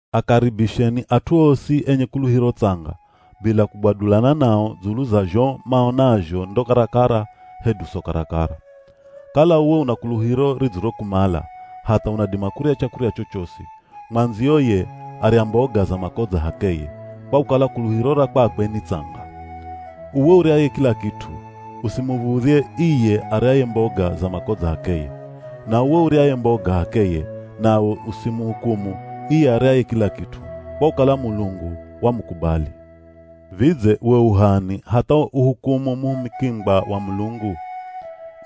Akaribisheni at'u osi enye kuluhiro tsanga bila kugwadulana nao dzulu za zho maonazho ndo karakara, hedu so karakara. Kala uwe una kuluhiro ridzirokumala hatha unadima kurya chakurya chochosi, mwandziyo ye, arya mboga za makodza h'akeye, kwa kukala kuluhiro ra kwakwe ni tsanga. Uwe uryaye kila kit'u, usimuv̱udhye iye aryaye mboga za makodza h'akeye. Na uwe uryaye mboga h'akeye nawe usimuhukumu iye aryaye kila kit'u, kwa kukala Mulungu wamukubali. Vidze we u h'ani hatha uhukumu muhumikingwa wa Mulungu?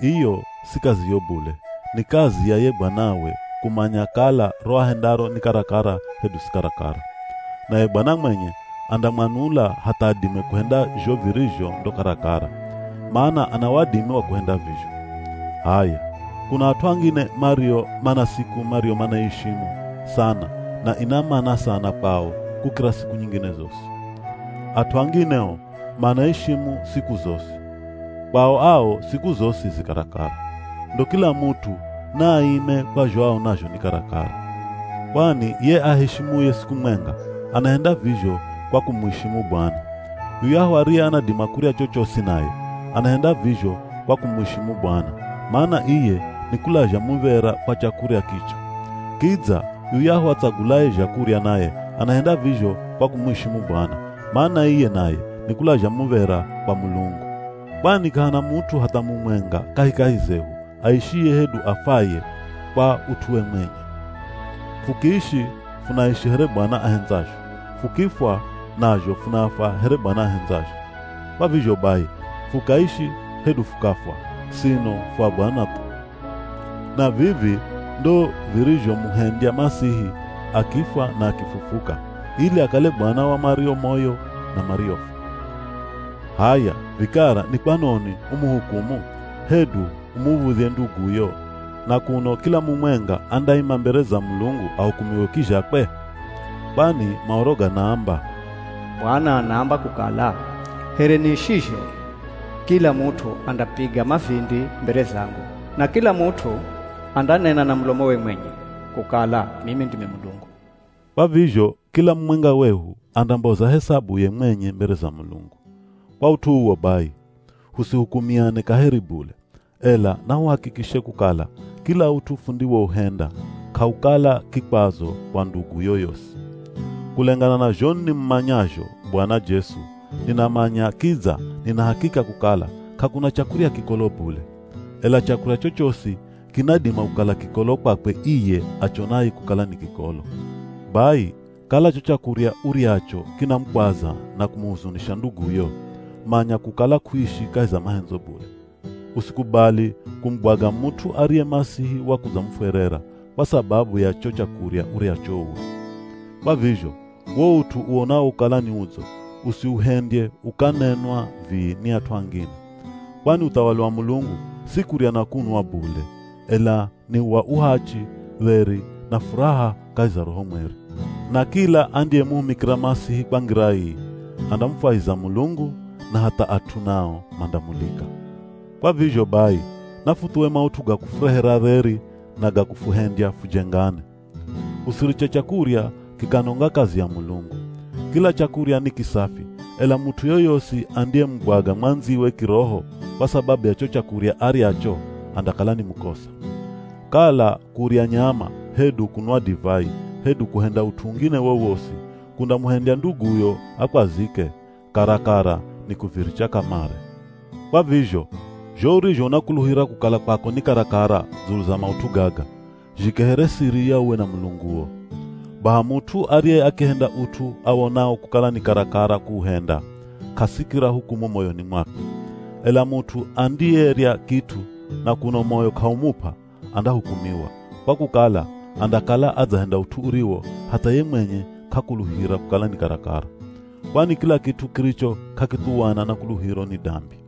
Iyo si kaziyo bule, ni kazi ya ye Bwanawe kumanya kala ro ahendaro ni karakara hedu si karakara. Naye Bwana mwenye andamwanula hatha adime kuhenda zho virizho ndo karakara, mana ana wadimi wa kuhenda vizho. H'aya, kuna at'u angine mario mana siku mariyo manaiishimu sana na ina mana sana kwao kukira siku nyingine zosi. At'u angine o manaishimu siku zosi, kwao ao siku zosi zi karakara. Ndo kila mut'u naaime kwa zho aonazho ni karakara. Kwani ye aheshimuye siku mwenga, anahenda vizho kwa kumuishimu Bwana. Yuyahu ariye anadima kurya chochosi naye, anahenda vizho kwa kumuishimu Bwana, mana iye nikulazha muv̱era kwa chakurya kicho. Kidza yuyahu atsagulaye zhakurya naye anahenda vizho kwa kumuishimu Bwana, mana iye naye nikulazha muv̱era kwa Mulungu. Kwani k'ahana mut'u hatha mumwenga kahikahi zehu aishiye hedu afwaye kwa ut'uwe mwenye. Fukiishi funaishi here Bwana ahendzazho, fukifwa nazho funafwa here Bwana ahendzazho. Kwa vizho bai, fukaishi, hedu fukafwa sino fu a Bwana thu. Na vivi ndo virizhomuhendya Masihi akifwa na akifufuka, ili akale Bwana wa mario moyo na mariofwa. H'aya vikara ni kwanoni umuhukumu, hedu umuv̱udhye nduguyo, na kuno kila mumwenga andaima mbere za Mulungu ahukumiwe kizhakwe? Kwani Maoro ganaamba, “Bwana anaamba kukala, ‘Here niishizho, kila mut'u andapiga mavindi mbere zangu, na kila mut'u andanena na mulomowe mwenye, kukala mimi ndimi Mulungu.’” Kwa vizho kila mumwenga wehu andamboza hesabuye mwenye mbere za Mulungu. Kwa ut'u uwo bai, husihukumiane kaheri bule, ela nahuhakikishe kukala kila ut'u fundiwouhenda k'aukala kikwazo kwa ndugu yoyosi. Kulengana na zho nimumanyazho Bwana Jesu, ninamanya kidza nina hakika kukala k'akuna chakurya kikolo bule. Ela chakurya chochosi kinadima kukala kikolo kwakwe iye achonaye kukala ni kikolo. Bai kala cho chakurya uryacho kinamukwaza na kumuhuzunisha nduguyo, manya kukala k'uishi kahi za mahendzo bule. Usikubali kumugwaga mut'u ariye Masihi wakudzamufwerera, kwa sababu ya cho chakurya uryacho uwe. Kwa vizho, wo ut'u uwonawo kukala ni udzo, usiuhendye ukanenwa vii ni at'u angine. Kwani uthawali wa Mulungu si kurya na kunwa bule, ela ni wa uhachi, dheri, na furaha kahi za Roho Mweri. Na kila andiyemuhumikira Masihi kwa ngira ii, andamufwahiza Mulungu na hatha at'u nao mandamulika. Kwa vizho bai, nafuthuwe maut'u ga kufurehera dheri na ga kufuhendya fujengane. Usiriche chakurya kikanonga kazi ya Mulungu. Kila chakurya ni kisafi, ela mut'u yoyosi andiyemugwaga mwandziwe kiroho, kwa sababu ya cho chakurya aryacho andakala ni mukosa. Kala kurya nyama, hedu kunwa divai, hedu kuhenda ut'u ungine wowosi kundamuhendya nduguyo akwazike, karakara ni kuviricha kamare. Kwa vizho, zho urizho unakuluhira kukala kwako ni karakara dzulu za maut'u gaga, zhike here siri ya uwe na Mulunguo. Baha mut'u ariye akihenda ut'u awonao kukala ni karakara kuuhenda, k'asikira hukumu moyoni mwakwe. Ela mut'u andiyerya kit'u na kuno moyo k'aumup'a, andahukumiwa, kwa kukala andakala adzahenda ut'u uriwo hatha ye mwenye k'akuluhira kukala ni karakara. Kwani kila kit'u kiricho k'akithuwana na kuluhiro ni dambi.